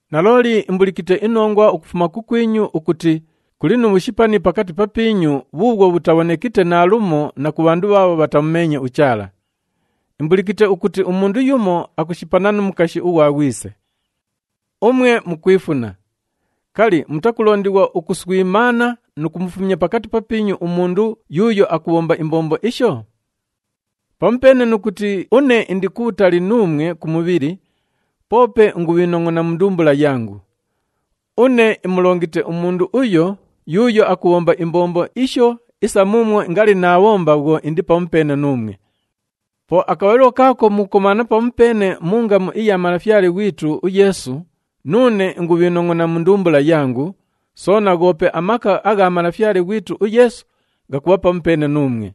Nalooli imbulikite inongwa ukufuma kukwinyu ukuti kuli nu bhushipani pakati papiinyu bhuubhwo bhutabhonekite naalumo na ku bhandu bhaabho bhatamumeenye uChaala. Imbulikite ukuti umundu yumo akushipana nu mukashi ughwa ghwise. Umwe mukwifuna! Kali, mutakulondighwa ukuswimaana nu kumufumya pakati papiinyu umundu yuuyo akubhomba imbombo isho? Pamupeene nu kuti une indi kubhutali nuumwe ku mubhili, poope ingubhiinongʼona mu ndumbula yangu. Une imulongite umundu uyo yuuyo akubhomba imbombo isho isa muumwo ngali naabhomba bhwo indi pamupeene nuumwe. Po akabhalilo kaako mukukomaana pamupeene mu ngamu iya Malafyale ghwitu uYeesu, nuune ingubhiinongʼona mu ndumbula yangu, soona ghoope amaka agha Malafyale ghwitu uYeesu ghakubha pamupeene nuumwe.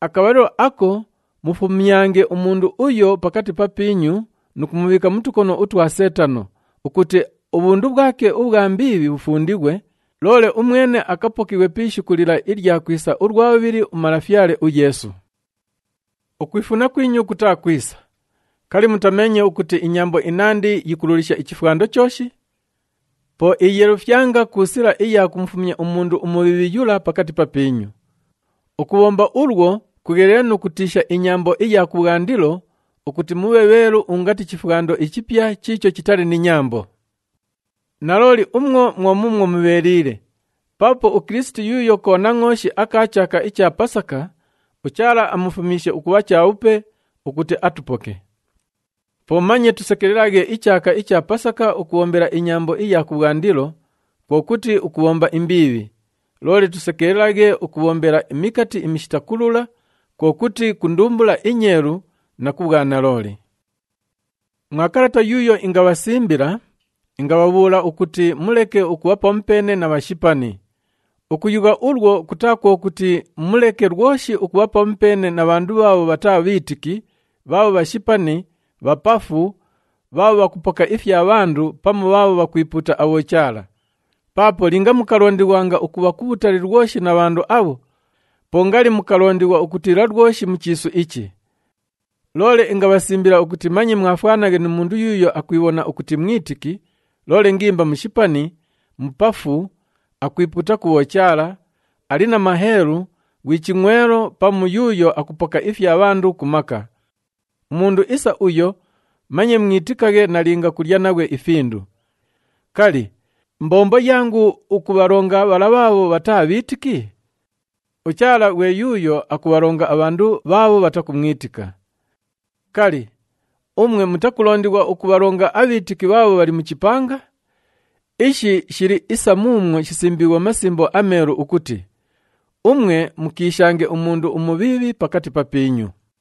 Akabhalilo ako mufumyange umundu uyo pakati papiinyu nu kumubhiika mu tukono utwa Seetano ukuti ubhundu bhwake ubhwa mbiibhi bhufundighwe, loole umwene akapokighwe pi ishiku lila ilya kwisa ulwa bhubhili uMalafyale uYeesu. Ukwifuna kwinyu kutaa kwisa. Kali, mutameenye ukuti inyambo inandi yikululisha ichifwando chooshi? Po iyeelufyanga ku sila iya kumufumya umundu umubhiibhi yula pakati papiinyu. Ukubhomba ulwo kugheliile nu kutiisha inyambo iya kubhwandilo ukuti mubhe bheelu ungati chifwando ichipya chiicho chitali ni nyambo. Nalooli umwo mwo muumwo mubheeliile paapo uKilisiti yuuyo Konangʼooshi aka chaaka icha Pasaka uChaala amufumyishe ukubha chabhupe ukuti atupoke. Po manye tusekelelaghe ichaaka icha Pasaka ukubhombela inyambo iya kubhwandilo, kwo kuti ukubhomba imbiibhi, loole tusekelelaghe ukubhombela imikati imishita kulula, kwo kuti ku ndumbula inyeelu na ku bhwanalooli. Mwa kalata yuuyo ingabhasimbila, ingabhabhuula ukuti muleke ukubha pamupeene na bhashipani. Ukuyugha ulwo, kutaa kwo kuti muleke lwoshi ukubha pamupeene na bhandu bhaabho bhataa bhiitiki bhaabho bhashipani, bhapafu, bhaabho bhakupoka ifya bhandu pamu bhaabho bhakwipuuta abhochaala. Paapo linga mukalondighwanga ukubha kubhutali lwoshi na bhandu abho, po ngali mukalondighwa ukutiila lwoshi mu chiisu ichi. Loole ingabhasimbila ukuti manye mwafwanaghe nu mundu yuuyo akwibhona ukuti mwitiki, loole ngimba mushipani, mupafu, akwipuuta ku bhochaala, ali na maheelu, ghwi chingʼwelo pamu yuuyo akupoka ifya bhandu ku maka. Umundu isa uyo manye mwitikaghe nalinga kulya naghwe ifindu. Kali, mbombo yangu ukubhalonga bhala bhaabho bhataa bhiitiki? UChaala ghwe yuuyo akubhalonga abhandu bhaabho bhatakumwitika. Kali, umwe mutakulondighwa ukubhalonga abhiitiki bhaabho bhali mu chipanga? Ishi shili isa muumwo shisimbiighwe mu Masimbo aMeelu ukuti, “Umwe mukiishange umundu umubhiibhi pakati papiinyu.”